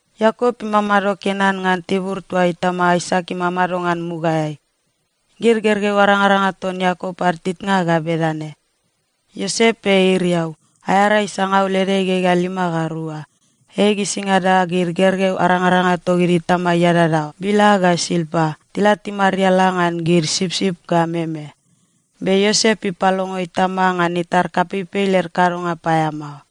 Iakop imamado Kenan ngan tibur toa itama Aisak imamado ngan mugaeai. Gid gergeu arangaranga ton Iakop ad titnga ga bedane: Iosep ei iriau, aea rai sangaul ede igegea lima ga rua. Ei gisingada gid gergeu arangaranga togid itama iadadaoa, Bila ga Silpa, tila timariala ngan gid sipsip ga meme. Be Iosep ipalongo itama ngan itar kapeipei led kadonga paeamao.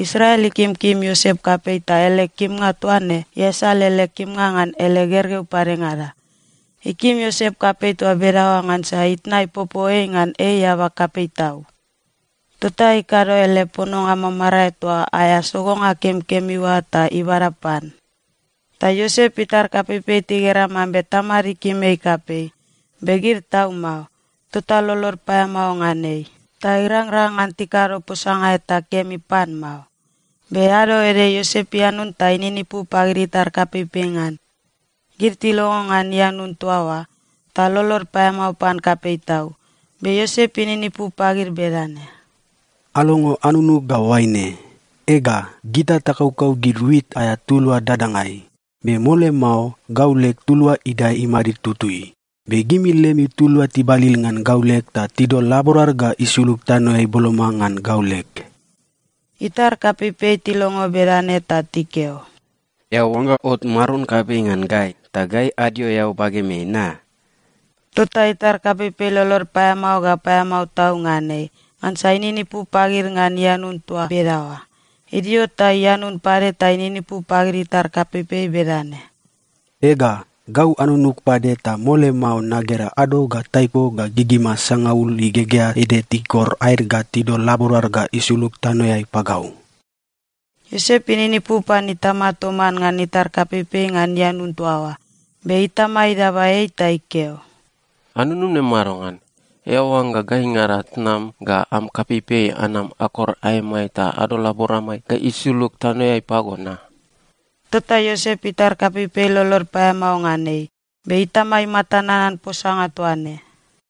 Israel ikimkim Iosep kapei ta ele kimnga toa ne iasal ele kimnga ngan ele gergeu padengada. Ikim Iosep kapei toa bedaoa ngansa itna ipopo ei ngan ei eaba kapei tau. Tota ikado ele pononga mamarae toa aea sogonga kemikemi oa ta ibada pan. Ta Iosep itar kapeipei tigera mambe tamad ikim ei kapei, be gid tau mao. Tota lolod paeamao ngan ei, ta irangrang ngan tikado posanga eta kemi pan mao. Be ado ede Iosep ianun ta ininipu pagid itar kapeipei ngan. Gid tilongo ngan ianun toa oa, ta lolod paeamao pan kapei tau. Be Iosep ininipu pagid bedane, “Alongo anunug ga oaine: Ega, gita takaukau gid wit aea tulua dadangai. Be mole mao, gau leg tulua idae imadid tutui, be gimi lemi tulua tibalil ngan gau leg ta tidol laborad ga isulug tanoeai boloma ngan gau leg.” Itar kapeipei tilongo bedane ta tikeo, “Eao oangga ot maron kapei ngan gai, ta gai adio eao bagemeai na?” Tota itar kapeipei lolod paeamao ga paeamao tau ngan ei, ngansa ininipu pagid ngan ianun toa bedaoa. Idio ta ianun pade ta ininipu pagid itar kapeipei bedane, “Ega, gau anunug pade ta mole mao nagera ado ga taiko ga gigima sangaul igegea ede tikor aed ga tidol laborad ga isulug tanoeai pagau.” Iosep ininipu pan itama toman ngan itar kapeipei ngan ianun toa oa, be itama idaba ei ta ikeo, “Anunum ne madongan? Eao oangga gaingada tnam ga am kapeipei anam akor aemai ta adol laboramai ga isulug tanoeai pago na?” Tota Iosep itar kapeipei lolod paeamao ngan ei, be itama imata nanan posanga toa ne.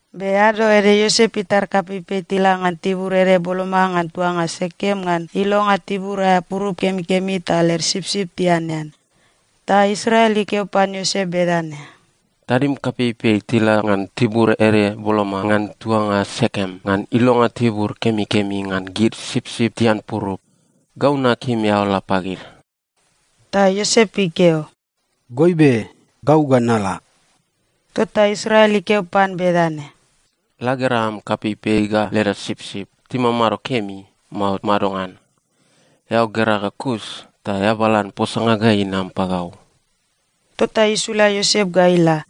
Be ado ede Iosep itar kapeipei tila ngan tibur ede boloma ngan tuanga Sekem ngan ilonga tibur aea purup kemikemi ta led sipsip tianean. Ta Israel ikeo pan Iosep bedane, “Tadim kapeipei tila ngan tibur ede boloma ngan tuanga Sekem ngan ilonga tibur kemikemi ngan gid sipsip tian purup. Gau nakim eao la pagid.” Ta Iosep ikeo, “Goibe. Gau ga nala.” Tota Israel ikeo pan bedane, “La gera am kapeipei ga leda sipsip, timamado kemi, mao madongan? Eao gera ga kus ta eabalan posanga ga inam pagau.” Tota isula Iosep ga ila.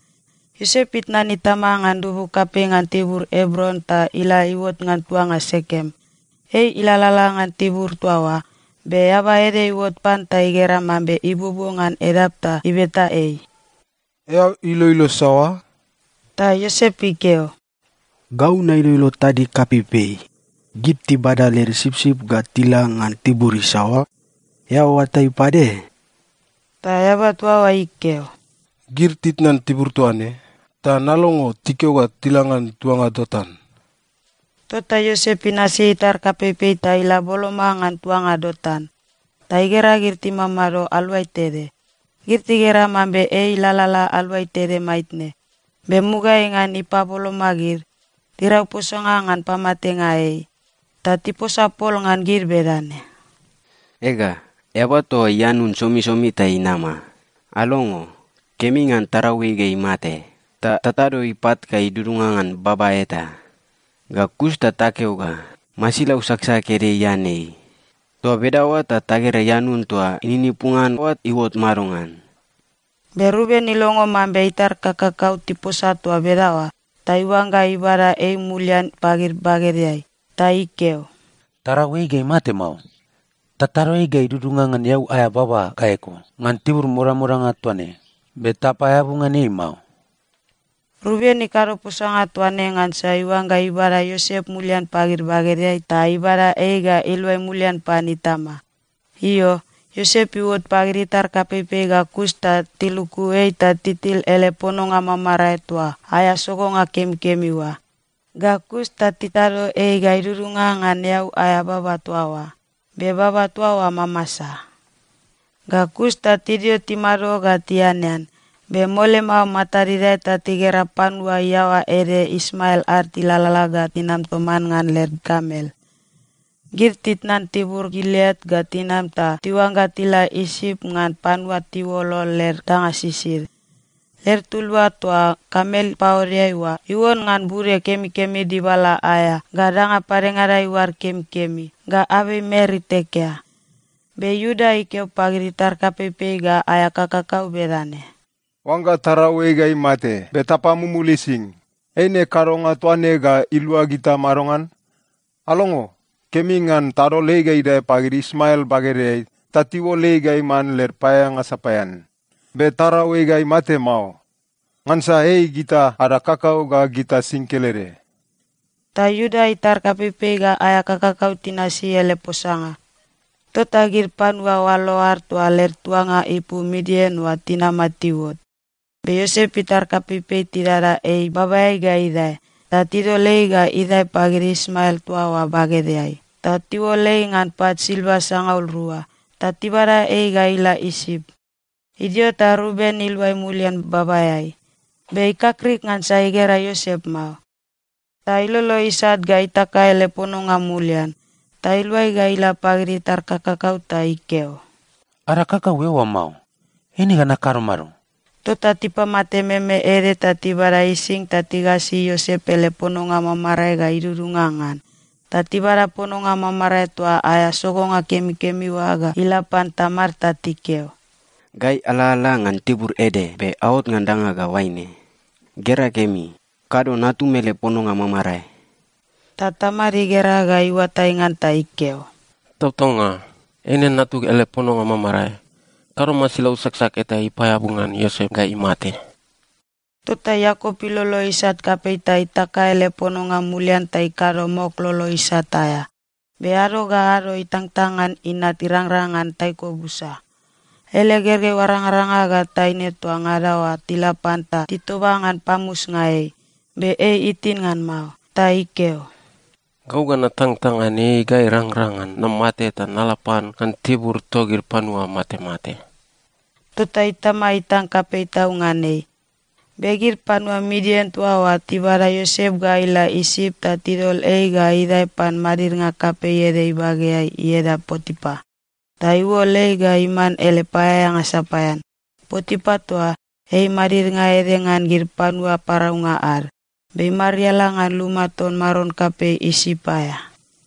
Iosep itnan itama ngan dubu kapei ngan tibur Ebron ta ila iuot ngan tuanga Sekem. Ei ilalala ngan tibur toa oa, be eaba ede iuot pan ta igera mambe ibuobuo ngan edap ta ibeta ei, “Eao iloilo saoa?” Ta Iosep ikeo, “Gau nailoilo tadig kapeipei. Gid tibada led sipsip ga tila ngan tibur isaoa? Eao oatai pade?” Ta eaba toa oa ikeo, “Gid titnan tibur toa ne ta nalongo tikeo ga tila ngan tuanga Dotan.” Tota Iosep inasi itar kapeipei ta ila boloma ngan tuanga Dotan, ta igera gid timamado aluai tede. Gid tigera mambe ei ilalala aluai tede maitne, be mugaeai ngan ipaboloma gid, tirau posanga ngan pamatenga ei. Ta tiposa pol ngan gid bedane, “Ega, eaba toa ianun somisomi ta inama. Alongo! Kemi ngan tarau ei ga imate, ta tatado ipat ga idudunga ngan baba eta. Ga kus ta takeo ga, ‘Masilau saksak ede ian ei.’ Toa bedaoa ta tagera ianun toa ininipu ngan oa iuot madongan.” Be Ruben ilongo mambe itar kakakau tiposa toa bedaoa, ta iuangga ibada ei mulian pagid bagedeai. Ta ikeo, “Tarau ei ga imate mao. Tatado ei ga idudunga ngan eau aea baba ga eko, ngan tibur modamodanga toa ne. Be tapaeabu ngan ei mao.” Ruben ikado posanga toa ne ngansa iuangga ibada Iosep mulian pagid bagedeai ta ibada ei ga iluai mulian pan itama. Io, Iosep iuot pagid itar kapeipei ga kus ta tiluku ei ta titil ele pononga mamarae toa aea sogonga kemikemi oa. Ga kus ta titado ei ga idudunga ngan eau aea baba toa oa. Be baba toa oa mamasa. Ga kus ta tidio timado ga tianean, be mole mao matad idae ta tigera panua iaoa ede Ismael ad tilalala ga tinam toman ngan led kamel. Gid titnan tibur Gileat ga tinam ta tiuangga tila Isip ngan panua tiuolol led danga sisid. Led tulua toa kamel paodeai oa iuon ngan bude kemikemi dibala aea, ga danga padengada iuad kemikemi, ga abei mer itekea. Be Iuda ikeo pagid itar kapeipei ga aea kakakau bedane, “Oangga tarau ei ga imate, be tapamumul ising, eine kadonga toa ne ga ilua gita madongan? Alongo! Kemi ngan tadol ei ga idae pagid Ismael bagedeai ta tiuol ei ga iman led paeaeanga sapaean. Be tarau ei ga imate mao. Ngansa ei gita ada kakau ga gita sing kelede.” Ta Iuda itar kapeipei ga aea kakakau tinasi ele posanga. Tota gid panua oalo ad toa led tuanga ipu Midian oa tinama tiuot. Be Iosep itar kapeipei tidada ei babaeai ga idae, ta tidol ei ga idae pagid Ismael toa oa bagedeai, ta tiuol ei ngan pat silva sangaul rua. Ta tibada ei ga ila Isip. Idio ta Ruben iluai mulian babaeai, be ikakrik ngansa igera Iosep mao. Ta ilolo isat ga itaka ele pononga mulian. Ta iluai ga ila pagid itar kakakau ta ikeo, “Ada kakau eoa mao! Eine ga nakado mado?” Tota tipamate meme ede ta tibada ising ta tigasi Iosep ele pononga mamarae ga idudunga ngan. Ta tibada pononga mamarae toa aea sogonga kemikemi oa ga ila pan tamad ta tikeo, “Gai alalala ngan tibur ede, be aot ngan danga ga oaine. Gera kemi. Kado natum ele pononga mamarae.” Ta tamad igera ga iuatai ngan ta ikeo, “Tautaunga. Eine natug ele pononga mamarae! Kado masilau saksak eta ipaeabu ngan Iosep ga imate.” Tota Iakop ilolo isat kapei ta itaka ele pononga mulian ta ikado mok lolo isat aea. Be ado ga ado itangtang ngan inat irangrang ngan taiko busa. Ele gergeu arangaranga ga taine toa ngada oa tila pan ta titoba ngan pamusnga ei, be ei itin ngan mao. Ta ikeo, “Gau ga natangtang ngan ei ga irangrang ngan namate ta nala pan ngan tibur togid panua matemate.” Tota itama itang kapei tau ngan ei. Be gid panua Midian toa oa tibada Iosep ga ila Isip ta tidol ei ga idae pan madidnga kapei ede ibageai ieda Potipa, ta iuol ei ga iman ele paeaeanga sapaean. Potipa toa, ei madidnga ede ngan gid panua paraunga ad, be imariala ngan luma ton maron kapei Isip aea.